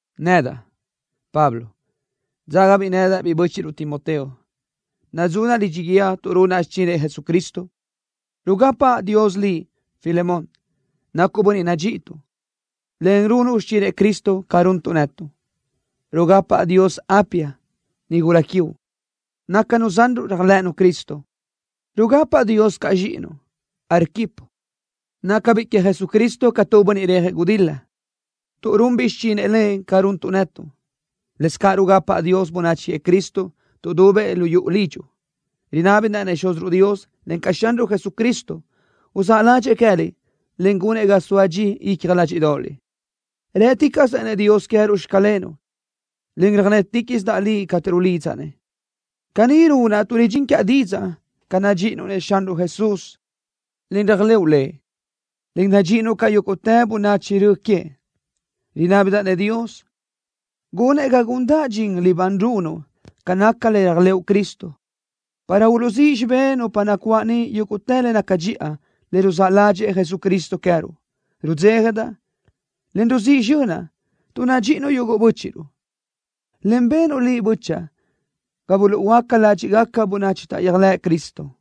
Nedaʼ, Pablo, dzágabiʼ nedaʼ biʼi bö́chiʼruʼ Timoteo. Nadzunaʼ lidxi guíë tuʼ runaʼ xichinëʼ Jesucristo. Rugapaʼ Dios liʼ, Filemón. Nacuʼ bönniʼ nadxíʼituʼ, en runuʼ xichinëʼ Cristo ca runtuʼ netuʼ. Rugapaʼ Dios Apia, nigula quiuʼ. Nácanu zanruʼ réajlëʼënu Cristo. Rugapaʼ Dios caʼ zxíʼinuʼ, Arquipo. Nácabiʼ queëʼ Jesucristo ca tu bönniʼ rejëʼ gudil-la, tuʼ runbiʼ xichinëʼ Lëʼ ca runtuʼ netuʼ. Lëscaʼ rugapaʼ Dios bönachi queëʼ Cristo tuʼdubëʼ lu yuʼu lidxuʼ. Rinábidaʼ-nëʼ Xúziruʼ Dios, encaʼ Xanruʼ Jesucristo, uzáʼ ládxëʼë queë́liʼ, en gunëʼ ga soa dxi icja ládxiʼdoʼoliʼ. Rë́ticaʼsaʼ-nëʼ Dios queë́ruʼ “Xclenuʼ”, en röjnéticaʼsidaʼ liʼ cateʼ rulidzaʼ-nëʼ. Caní runaʼ tuʼ ridxín quiaʼ didzaʼ ca nadxíʼinuʼ-nëʼ Xanruʼ Jesús, en réajlëʼu Lëʼ, en nadxíʼinuʼ caʼ yúguʼtë bönachi rö queëʼ. Rinábidaʼ-nëʼ Dios gunëʼ ga gundaʼ dxin libán runuʼ ca naca le réajlëʼu Cristo, para uluʼzíʼ xibé nupa nacuáʼ niʼ yúguʼtë le naca dxiʼa, le ruzáʼ ládxëʼë Jesucristo queë́ruʼ. Rudzéjadaʼ, en ruzíʼ zxönaʼ tuʼ nadxíʼinuʼ yuguʼ bö́chiʼruʼ, en benuʼ liʼ, bö́chaʼa, ga buluʼhuöáca ládxiʼgaca bönachi taʼyéajlëʼ Cristo.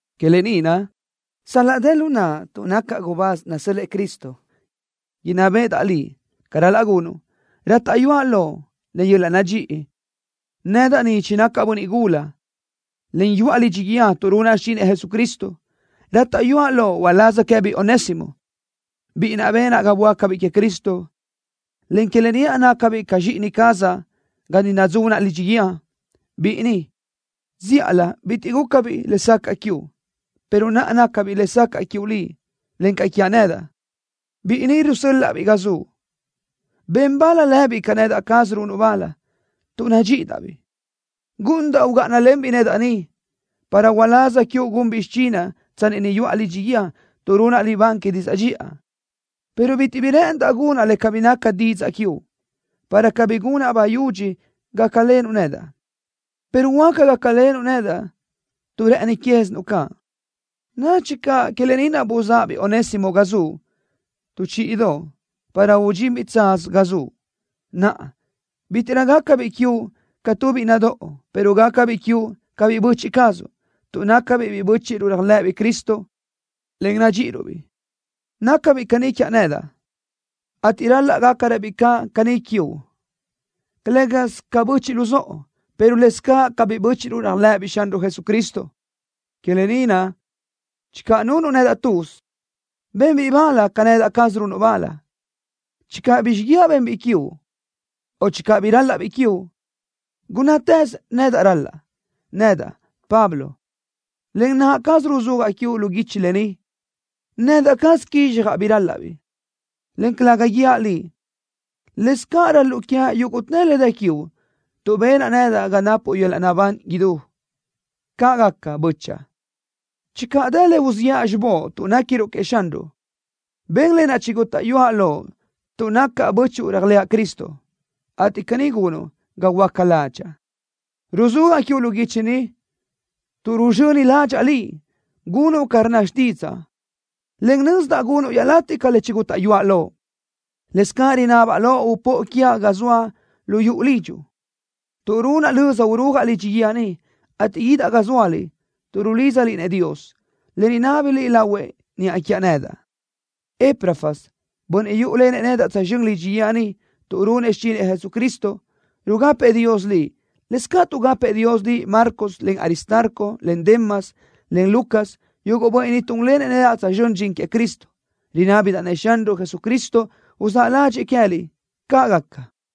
Que lë ni naʼ, sal-laʼ dë lu naʼa tuʼ nacaʼ gubáz nasö́l-lëʼë Cristo inná béʼedaʼ liʼ ca ral-laʼ gunuʼ, rátaʼyuaʼ loʼ len yöl-laʼ nadxíʼi, nedaʼ ni chinacaʼ bönniʼ gula, en yuʼa lidxi guíë tuʼ runaʼ xichinëʼ Jesucristo. Rátaʼyuaʼ loʼ uláz queë́biʼ Onésimo, biʼi naʼ benaʼ ga böácabiʼ queëʼ Cristo, en que lë ni naʼ nácabiʼ ca zxíʼini cazaʼ ga ni nadzunaʼ lidxi guíë. Biʼi ni, zíʼalö bitiʼ gúcabiʼ lesacaʼ quiuʼ, pero naʼa nácabiʼ lesacaʼ quiuʼ liʼ, encaʼ quiaʼ nedaʼ. Biʼi ni rusö́l-laʼa-biʼ ga zuʼ. Ben bal lëbiʼ ca nedaʼ caz runuʼ bal, tuʼ nadxíʼidaʼ-biʼ. Gúʼunidaʼ ugáʼanalenbiʼ nedaʼ ni, para uláz quiuʼ gunbiʼ xichinaʼ tsanni ni yuʼa lidxi guíë tuʼ runaʼ libán que didzaʼ dxiʼa, pero bitiʼ bi rë́ʼëndaʼ gunaʼ le cabí naca didzaʼ quiuʼ, para cabí gunaʼ bayudxi gácalenuʼ nedaʼ, pero huáca gácalenuʼ nedaʼ tuʼ rë́ʼëni quézinuʼ caʼ. Nadxi caʼ que lë ni naʼ buzáʼabiʼ Onésimo ga zuʼ tu chíʼidoʼ para udxinbiʼ tsaz ga zuʼ. Naʼa, bítiʼrö gácabiʼ quiuʼ ca tu biʼi nadóʼo, pero gácabiʼ quiuʼ ca biʼi böchiʼ cazuʼ, tuʼ nácabiʼ biʼi bö́chiʼruʼ réajlëʼëbiʼ Cristo, en nadxíʼiruʼ-biʼ. Nácabiʼ caní quiaʼ nedaʼ, ateʼ ral-laʼ gácaröbiʼ caʼ caní quiuʼ, calë́gasö ca böchiʼ luzóʼo, pero lëscaʼ ca biʼi bö́chuʼu réajlëʼëbiʼ Xanruʼ Jesucristo. Que lë ni naʼ, channö nunuʼ nedaʼ tuz, ben lëbiʼ bal ca nedaʼ caz runuʼ bal. Channö bi xíguiaʼ benbiʼ quiuʼ o channö bi rál-laʼbiʼ quiuʼ, gunnátëz nedaʼ ral-laʼa. Nedaʼ, Pablo, len naʼa cazaʼ ruzúajaʼ quiuʼ lu guichi lë ni: Nedaʼ caz quizxjaʼ bi rál-laʼbiʼ, en calëga guíaʼ liʼ: Lëscaʼ ral-luʼu quiaʼ yúguʼtë le dë quiuʼ tuʼ benaʼ nedaʼ ga napuʼ yöl-laʼ naʼbán idú. Caʼ gaca, bö́chaʼa. Channö dë le uziʼa xibóʼ tuʼ néquiruʼ queëʼ Xanruʼ, ben lë naʼ chigútaʼyuaʼ loʼ tuʼ nacaʼ bö́chuʼu réajlëʼa Cristo, ateʼ caní gunuʼ ga huöáca ládxaʼa. Ruzúajaʼ quiuʼ lu guichi ni, tuʼ ruzxöni ládxaʼa liʼ, gunuʼ ca rnna xtídzaʼa, en nözdaʼ gunuʼ iaʼlatiʼ ca lë naʼ chigútaʼyuaʼ loʼ. Lëscaʼ rinabaʼ loʼ upóʼo quiaʼ ga soaʼ lu yuʼu lidxuʼ, tuʼ runaʼ löza urúajaʼ lidxi guíë ni, ateʼ guídaʼ ga zóaliʼ tuʼ rulídzaliʼ-nëʼ Dios, en rinábaliʼ lahuëʼ niʼa quiaʼ nedaʼ. Epafras, bönniʼ yúʼulenëʼ nedaʼ tsözxö́n lidxi guíë ni tuʼ runëʼ xichinëʼ Jesucristo, rugapëʼ Dios liʼ. Lëscaʼ tuʼgapëʼ Dios liʼ Marcos, en Aristarco, en Demas, en Lucas, yuguʼ bönniʼ ni túnlenëʼ nedaʼ tsözxö́n dxin queëʼ Cristo. Rinábidaʼ-nëʼ Xanruʼ Jesucristo uzáʼ ládxëʼë queë́liʼ. ¡Caʼ gaca!